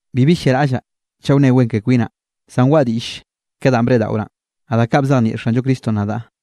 Bibi lliaraꞌllaꞌ chaꞌ wne wen ke kwinaꞌ, zan waꞌa diꞌll ke danꞌ ba breꞌdaꞌoraꞌn, naꞌ da kaꞌ ba bzejnieꞌ Xanllo Cristonꞌ nadaꞌ.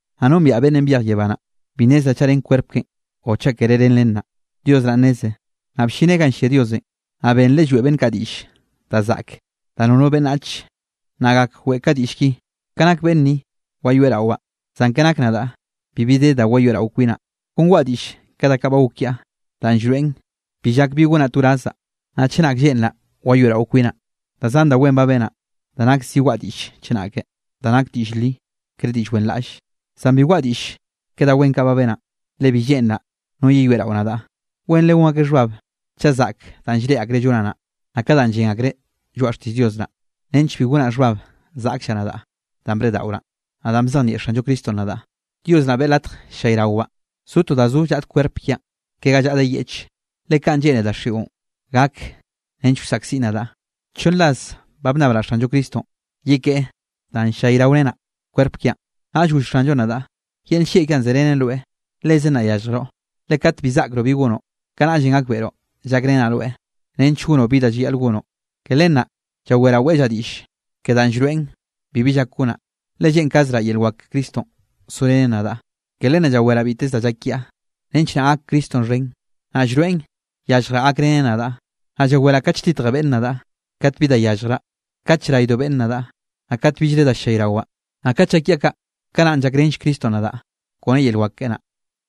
Naꞌ nombiaꞌ beꞌnnenꞌ byej yebá naꞌ. Bi nnezraꞌ chaꞌ ren kwerp keꞌen o chaꞌ kere ren len naꞌ, Dios naꞌ nneze. Naꞌ bllineꞌ ganꞌ llia Diosenꞌ, naꞌ benreꞌ lloeꞌ beꞌnn kaꞌ diꞌll da zaꞌke da nono beꞌnnach nna gak weꞌe ka diꞌll ki. Ka nak beꞌnn ni wayoeꞌrawaꞌ, zan ka nak nadaꞌ bibi de da wayoeꞌrawaꞌ kwinaꞌ. Kon waꞌa diꞌll ke da kaꞌ ba gok kiaꞌ, danꞌ llroeꞌn bi llak bi gonaꞌ to wrazzaꞌ. Naꞌ chenak lleꞌnraꞌ wayoeꞌrao kwinaꞌ, da zan da wen ba benaꞌ da nak zi waꞌa diꞌll chenak, da nak diꞌll li, kere diꞌll wenraꞌlle. Zan bi waꞌa diꞌll ke da wen kaꞌ ba benaꞌn, le bi lleꞌnraꞌ no yeyoeꞌrao nadaꞌ. Wenre gon akeꞌ xhbab chaꞌ zaꞌk danꞌ llreꞌe akreꞌ llonaꞌ naꞌ, naꞌ ka danꞌ llen akreꞌ lloaꞌa xtiꞌll Dios naꞌ. Nench bi gonaꞌ xhbab zaꞌkllaꞌ nadaꞌ danꞌ breꞌdaꞌoraꞌn, naꞌ danꞌ bzejnieꞌ Xanllo Cristonꞌ nadaꞌ, Dios naꞌ beꞌe latj ll-llayrawaꞌ zo to da zo llaꞌd kwerp kiaꞌn, ke ga llaꞌde yeꞌch, le kaꞌn lleꞌne daxiꞌon gak nench wsaꞌkziꞌn nadaꞌ. Chonn ras ba bnnabraꞌ Xanllo Cristonꞌ yekeꞌe danꞌ ll-llayraorenaꞌ kwerp kiaꞌn. Naꞌll goll Xanllonꞌ nadaꞌ: “Yel nllieꞌ kiaꞌn zerenen rweꞌ. Lezen naꞌ yalljroꞌ. Le kat bi zaꞌkroꞌ bi gonoꞌ, kanaꞌllenꞌ gakbeꞌroꞌ llakrenaꞌ rweꞌ nench gonoꞌ bi da llayaꞌl gonoꞌ.” Ke len naꞌ llaweraꞌ weꞌllaꞌ diꞌll, ke danꞌ llroeꞌn bibi llak gonaꞌ, le lleꞌnkazraꞌ yel wak ke Cristonꞌ sorenen nadaꞌ. Ke len naꞌ llaweraꞌ biteze da llak kiaꞌ nench naꞌ gak Cristonꞌ xhen, naꞌ llroeꞌn yalljraꞌ gakreneꞌ nadaꞌ. Naꞌ llaweraꞌ kate lltitje beꞌnne nadaꞌ, kat bi da yalljraꞌ, kate llraydo beꞌnne nadaꞌ, naꞌ kate billre da llayrawaꞌ. Naꞌ kat llak kiaꞌ kaꞌ, kanaꞌn llakrenll Cristonꞌ nadaꞌ kone yel wak keꞌe naꞌ.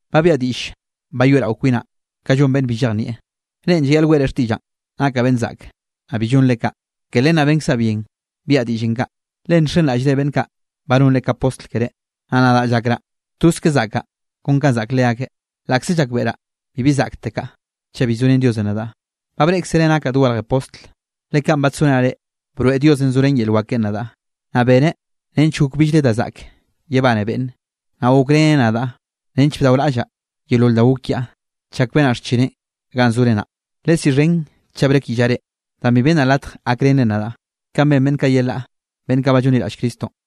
Ba biaꞌa diꞌll bayoeꞌrao kwinaꞌ ka llon beꞌnn bi llejnieꞌ. Reꞌn llayaꞌl weꞌre xtiꞌllaꞌn nakaꞌ beꞌnn zaꞌke, naꞌ bi llonre kaꞌ. Ke len naꞌ benkzaꞌ bien biaꞌa diꞌllenꞌ kaꞌ. Le nxenraꞌllre beꞌnn kaꞌ ba nonre ka postl keré. Naꞌ nadaꞌ llakraꞌ toz ka zaꞌkaꞌ kon kanꞌ zaꞌk leakeꞌ, laꞌkze llakbeꞌraꞌ bibi zaꞌktekaꞌ chaꞌ bi zorén Diosenꞌ nadaꞌ. Ba breꞌkzere nakaꞌ dogarje postl, le kanꞌ badsorenaꞌ reꞌ, broeꞌ Diosenꞌ zorén yel wak keꞌen nadaꞌ, naꞌ beneꞌ nench gok billre da zaꞌk yebane beꞌnne, naꞌ gokreneꞌ nadaꞌ nench bdaoraꞌllaꞌ yeolol da gok kiaꞌ chak benaꞌ xchineꞌn ganꞌ zore naꞌ. Lesiꞌxhen chaꞌ brekyiꞌllaꞌ reꞌ, danꞌ bi bennaꞌ latj gakrenre nadaꞌ, kanꞌ ben beꞌnn kaꞌ yelaꞌ beꞌnn kaꞌ ba llonliraꞌll Cristonꞌ.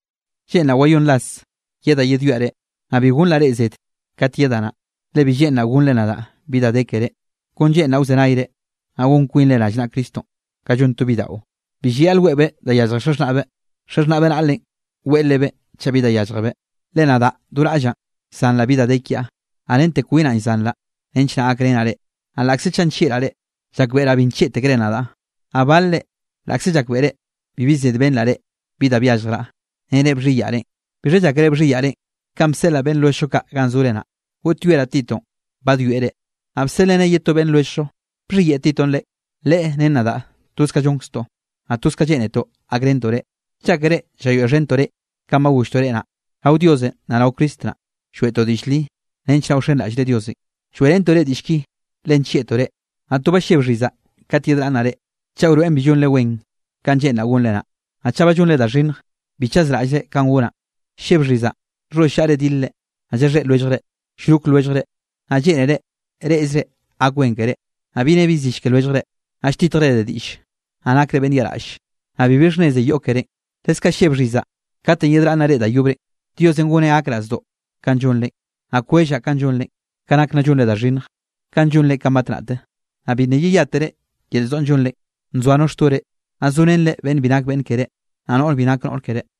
Lleꞌnraꞌ wayónn ras yedaꞌ yedwiaꞌ reꞌ, naꞌ bi gonraꞌ reꞌ zed kat yedaꞌ naꞌ. Le bi lleꞌnraꞌ gonnre nadaꞌ bi da de keré, kon lleꞌnraꞌ wzenayre, naꞌ gon kwinre rallnaꞌa Cristonꞌ. Ka llon to bidaꞌo, bi llayaꞌl weꞌbeꞌ da yallje xaxhnaꞌbeꞌ, xaxhnaꞌbeꞌ naꞌlenꞌ weꞌe lebeꞌ chaꞌ bi da yálljebeꞌ. Le nadaꞌ do raꞌllaꞌ llzanraꞌ bi da de kiaꞌ, naꞌ rente kwinaꞌ llzanraꞌ nench naꞌ gakrenaꞌ reꞌ. Naꞌ laꞌkze chaꞌ nllieꞌraꞌ reꞌ, llakbeꞌraꞌ bi nllieꞌtekere nadaꞌ. Naꞌ balre laꞌkze llakbeꞌre bibi zed benraꞌ reꞌ bi da byalljraꞌ, nere bxhiyaꞌ reꞌn. ¿Bixha llákere bxhiyaꞌ reꞌn kanꞌ bseꞌlaꞌ beꞌnn lwelljllo kaꞌ ganꞌ zore naꞌ? Goꞌtyoeraꞌ Titonꞌ badwieꞌ reꞌ, naꞌ bseꞌlreneꞌ ye to beꞌnn lwelljllo. ¿Bxhiyeꞌe Titonꞌ reꞌ? Leꞌe ren nadaꞌ toz ka llonkztoꞌ, naꞌ toz kanꞌ lleꞌnetoꞌ gakrentoꞌ reꞌ. ¿Llákere llayoeꞌxhentoꞌ reꞌn kanꞌ ba golltoꞌ reꞌ naꞌ? Rao Diosenꞌ naꞌ rao Cristo naꞌ, lloeꞌtoꞌ diꞌll li nench naꞌ wxenraꞌllre Diosenꞌ, lloeꞌrentoꞌ reꞌ diꞌll ki le nllieꞌtoꞌ reꞌ. Naꞌ to ba lleb xhizaꞌ kate yedraꞌnnaꞌ reꞌ, chaꞌ wroeꞌn bi llonre wen kanꞌ lleꞌnraꞌ gonre naꞌ. Naꞌ chaꞌ ba llonre da xhinnj, bi chazraꞌllre kanꞌ gonaꞌn. Lleb xhizaꞌ nxholl llaꞌre dilre, naꞌ llaxhéꞌ lwelljre, llrok lwelljre, naꞌ lleꞌnere reꞌze gak wen keré. Naꞌ bi ne bi zill ke lwelljre, naꞌ lltitjre de diꞌlle, naꞌ nakre beꞌnn yaꞌraꞌlle, naꞌ bibi xhnneze yoꞌ kerénꞌ. Leskaꞌ lleb xhizaꞌ katenꞌ yedraꞌnnaꞌ reꞌn da yobre, Diosenꞌ goneꞌ gakraꞌ zdoꞌ kanꞌ llonre. Naꞌ kwellaꞌ kanꞌ llonre, ka nak nna llonre da xhinnj, kanꞌ llonre kanꞌ batnaꞌte, naꞌ bi nna yeyátere da yel zdoꞌn llonre, nzoa no xtore, naꞌ zorenre beꞌnn bi nak beꞌnn keré, naꞌ noꞌr bi nak noꞌr keré.